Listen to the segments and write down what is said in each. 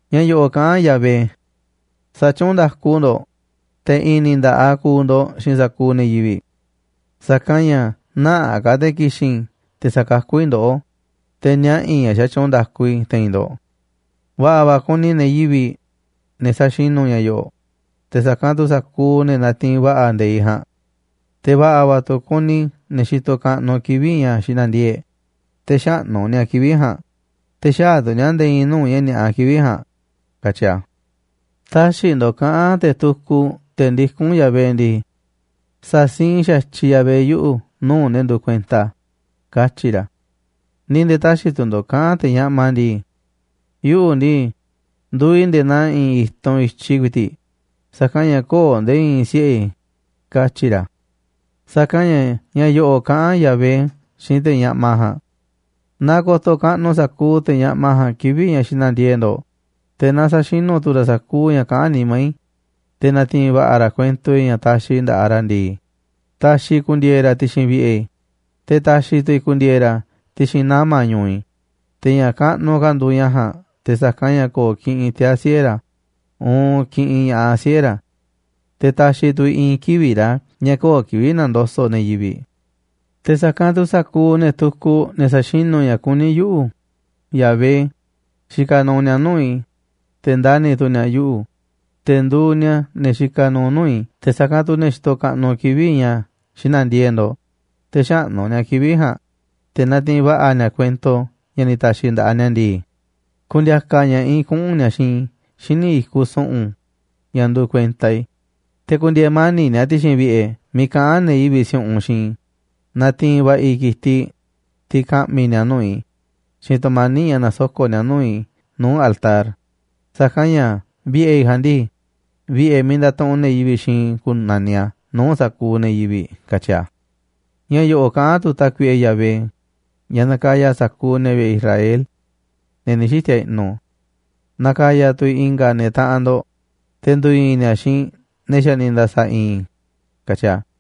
Ña̱ yo̱ꞌo̱ꞌ kaꞌán Yahvé: “Sa̱tyuunꞌ nda̱ku ndo̱ꞌ, te̱ i̱i̱n ni̱ nda̱ꞌaꞌ ku̱u̱ ndo̱ꞌ xiinꞌ sa̱kuuꞌ ne̱ yivi̱ꞌ. Sa̱kanꞌ ña̱ nä̱ꞌaꞌ ka̱ te̱ ki̱xi̱n i̱ te̱ sa̱kakú i̱ ndoꞌó, te̱ niaꞌa̱ i̱ ña̱ xatyuunꞌ nda̱ku i̱ te̱i̱n ndo̱ꞌ. Va̱ꞌa̱ va̱ kuni ne̱ yivi̱ꞌ, ne̱ sa̱xinu̱ ña̱ yo̱ꞌo̱ꞌ te̱ sa̱kanꞌ tu̱ sa̱kuuꞌ ne̱ natiinꞌ va̱ꞌa̱ nde̱iꞌ ja̱a̱nꞌ. Te̱ va̱ꞌa̱ va̱ tu̱ kuni ne̱ xitoꞌ kaꞌnuꞌ kivi̱ꞌ ña̱ xina̱ndiee̱ꞌ, te̱ xäꞌnú ni̱a̱ kivi̱ꞌ ja̱a̱nꞌ, te̱ xäaꞌ tu̱ ni̱a̱ nde̱e̱ i̱i̱n nuu̱ꞌ ña̱ ni̱a̱ꞌa kivi̱ꞌ ja̱a̱nꞌ”, katyi a̱. Tä̱xi̱ ndo̱ꞌ kaꞌa̱n te̱ tukuꞌ, te̱ ndikún Yahvé ndii: “Sa̱siinꞌ xa̱tyiꞌ Yahvé yuꞌu̱ nuu̱ꞌ ne̱ nduuꞌ kuenta a̱”, katyi̱ ra̱. Ni̱ nde̱e̱ tä̱xi̱ tu̱ ndo̱ꞌ kaꞌa̱n te̱ ñaꞌma ndii: “Yuꞌu̱ ndii, nduuꞌ i̱ nde̱e̱ naa i̱i̱n i̱tunꞌ i̱tyiꞌ ku̱i̱ti̱ꞌ, sa̱kanꞌ ña̱ köo̱ꞌ nde̱e̱ i̱i̱n siꞌe̱ i̱”, katyi̱ ra̱. Sa̱kanꞌ ña̱ ña̱ yo̱ꞌo̱ꞌ kaꞌán Yahvé xiinꞌ te̱ ñaꞌma ja̱a̱nꞌ: “Naaꞌ ko̱to̱ kaꞌnuꞌ sa̱kuuꞌ te̱ ñaꞌma ja̱a̱nꞌ kivi̱ꞌ ña̱ xina̱ndiee̱ꞌ ndo̱ꞌ, te̱ naa sa̱xinu̱ tu̱ ra̱ sa̱kuuꞌ ña̱ kaꞌán nimá i̱. Te̱ na̱ti̱i̱n va̱ꞌa̱ ra̱ kuento i̱ ña̱ taxiꞌ i̱ nda̱ꞌaꞌ ra̱ ndii, ta̱xi̱ i̱ ku̱ndi̱e̱e̱ ra̱ ti̱xi̱n vi̱ꞌe̱ i̱, te̱ ta̱xi̱ tu̱ i̱ ku̱ndi̱e̱e̱ ra̱ ti̱xi̱n nama̱ ñu̱u̱ i̱, te̱ ña̱ kaꞌnuꞌ ka̱ nduuꞌ ña̱ ja̱a̱nꞌ te̱ sa̱kanꞌ ña̱ ko̱o̱ kiꞌinꞌ tiaa̱ siꞌe̱ ra̱ uun kiꞌinꞌ ña̱ꞌaꞌ siꞌe̱ ra̱. Te̱ ta̱xi̱ tu̱ i̱ i̱i̱n kivi̱ꞌ ra̱ ña̱ köo̱ꞌ kivi̱ꞌ na̱ndoso̱ꞌ ne̱ yivi̱ꞌ. Te̱ sa̱kanꞌ tu̱ sa̱kuuꞌ ne̱ tukuꞌ, ne̱ sa̱xinu̱ ña̱ kuní yuꞌu̱, Yahvé, xikaꞌ nuuꞌ ni̱a̱ nuu̱ꞌ i̱, te̱ ndani̱ tu̱ ni̱a̱ yuꞌu̱. Te̱ nduuꞌ ni̱a̱ ne̱ xikaꞌ nuuꞌ nuu̱ꞌ i̱, te̱ sa̱kanꞌ tu̱ ne̱ xitoꞌ kaꞌnuꞌ kivi̱ꞌ ña̱ xina̱ndiee̱ꞌ ndo̱ꞌ, te̱ xäꞌnú ni̱a̱ kivi̱ꞌ ja̱a̱nꞌ. Te̱ natiinꞌ va̱ꞌa̱ ni̱a̱ kuento ña̱ ni̱ ta̱xi̱ i̱ nda̱ꞌaꞌ ni̱a̱ ndii, ku̱ndi̱a̱ka̱ ña̱ꞌaꞌ i̱ kuꞌu̱n ni̱a̱ xiinꞌ i̱ xíniꞌ i̱kuꞌ su̱ꞌu̱n, ña̱ nduuꞌ kuenta i̱. Te̱ ku̱ndi̱e̱e̱ mani̱ꞌ ni̱a̱ ti̱xi̱n vi̱ꞌe̱ miiꞌ kaꞌán ne̱ yivi̱ꞌ si̱u̱ꞌunꞌ xiinꞌ i̱. Na̱ti̱i̱n va̱ꞌa̱ i̱ ki̱tiꞌ, tiꞌ ka̱ꞌmi̱ ni̱a̱ nuu̱ꞌ i̱, xiinꞌ tu̱mani̱ꞌ ña̱ na̱soko̱ꞌ ni̱a̱ nuu̱ꞌ i̱ nuu̱ꞌ altar. Sa̱kanꞌ ña̱ vi̱ꞌe̱ i̱ ja̱a̱nꞌ ndii, vi̱ꞌe̱ miiꞌ ndatuꞌunꞌ ne̱ yivi̱ꞌ xiinꞌ i̱ ku̱na̱niꞌ a̱ nuu̱ꞌ sa̱kuuꞌ ne̱ yivi̱ꞌ”, katyi̱ a̱. Ña̱ yo̱ꞌo̱ꞌ kaꞌán tu̱ Tákuiꞌe Yahvé, ña̱ nakaya sa̱kuuꞌ ne̱ vi̱ꞌe̱ Israel, ne̱ ni̱ xiti̱a̱ i̱ꞌnu̱: “Na̱ka̱ya̱ tu̱ i̱ i̱nga̱ ne̱ taꞌanꞌ ndo̱ꞌ, te̱ ndu̱i̱i̱n ni̱a̱ xiinꞌ ne̱ xa̱ ni̱ nda̱sa̱ i̱i̱n i̱”, katyi a̱.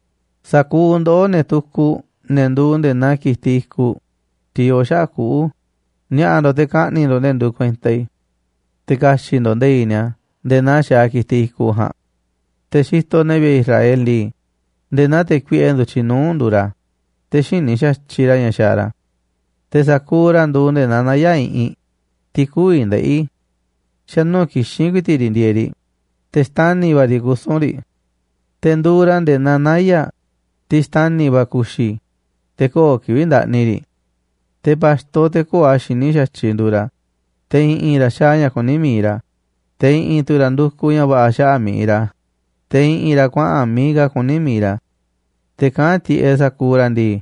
Sa̱kuuꞌ ndoꞌó, ne̱ tukuꞌ, ne̱ nduuꞌ nde̱e̱ naa ki̱tiꞌ i̱kuꞌ, tiꞌ yoo xaꞌa̱ꞌ kuꞌu̱, ni̱a̱ꞌa̱ ndo̱ꞌ te̱ ka̱ꞌni̱ꞌ ndo̱ꞌ ne̱ nduuꞌ kuenta i̱, te̱ ka̱xi̱ꞌ ndo̱ꞌ nde̱i̱ꞌ ni̱a̱ nde̱e̱ naa xaaꞌ ki̱tiꞌ i̱kuꞌ ja̱a̱nꞌ. Te̱ xitoꞌ ne̱ vi̱ꞌe̱ Israel ndii, nde̱e̱ naa te̱ kuiꞌe ndu̱tyiꞌ nuu̱ꞌ nduuꞌ ra̱, te̱ xïní xa̱tyiꞌ ra̱ ña̱ xaaꞌ ra̱. Te̱ sa̱kuuꞌ ra̱ nduuꞌ nde̱e̱ naa naya̱ꞌ iꞌinꞌ, tiꞌ kü̱vi̱ ndeꞌi̱. Xa̱nuu̱ꞌ kixín ku̱i̱ti̱ꞌ riꞌ ndieeꞌ riꞌ, te̱ xtani̱ va̱ riꞌ kusu̱n riꞌ. Te̱ nduuꞌ ra̱ nde̱e̱ naa naya̱ꞌ, tiꞌ xtani̱ va̱ ku̱xi̱, te̱ köo̱ꞌ kivi̱ꞌ ndaꞌni riꞌ. Te̱ pa̱xto, te̱ köo̱ꞌ a̱ xiní xa̱tyiꞌ, nduuꞌ ra̱. Te̱ i̱ꞌi̱n ra̱ xaaꞌ ña̱ kuní mi̱iꞌ ra̱, te̱ i̱ꞌi̱n tu̱ ra̱ ndukuꞌ ña̱ va̱ꞌa̱ xaꞌa̱ꞌ mi̱iꞌ ra̱, te̱ i̱ꞌi̱n ra̱ kuaꞌa̱n miiꞌ ka̱ kuní mi̱iꞌ ra̱. Te̱ kaꞌán tiꞌeꞌ sa̱kuuꞌ ra̱ ndii: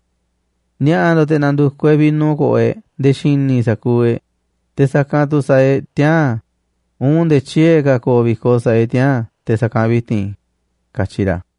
“Ni̱a̱ꞌa̱ ndo̱ꞌ te̱ na̱ndu̱kuꞌ e̱ꞌ vino ko̱ꞌo̱ e̱ꞌ nde̱e̱ xi̱ni̱ sa̱kuuꞌ e̱ꞌ. Te̱ sa̱kanꞌ tu̱ sa̱a̱ e̱ꞌ tiaa̱n uun nde̱e̱ tyiee̱ ka̱ ko̱o̱ vi̱koꞌ sa̱a̱ e̱ꞌ tiaa̱n te̱ sa̱kanꞌ vi̱ti̱n”, katyi ra̱.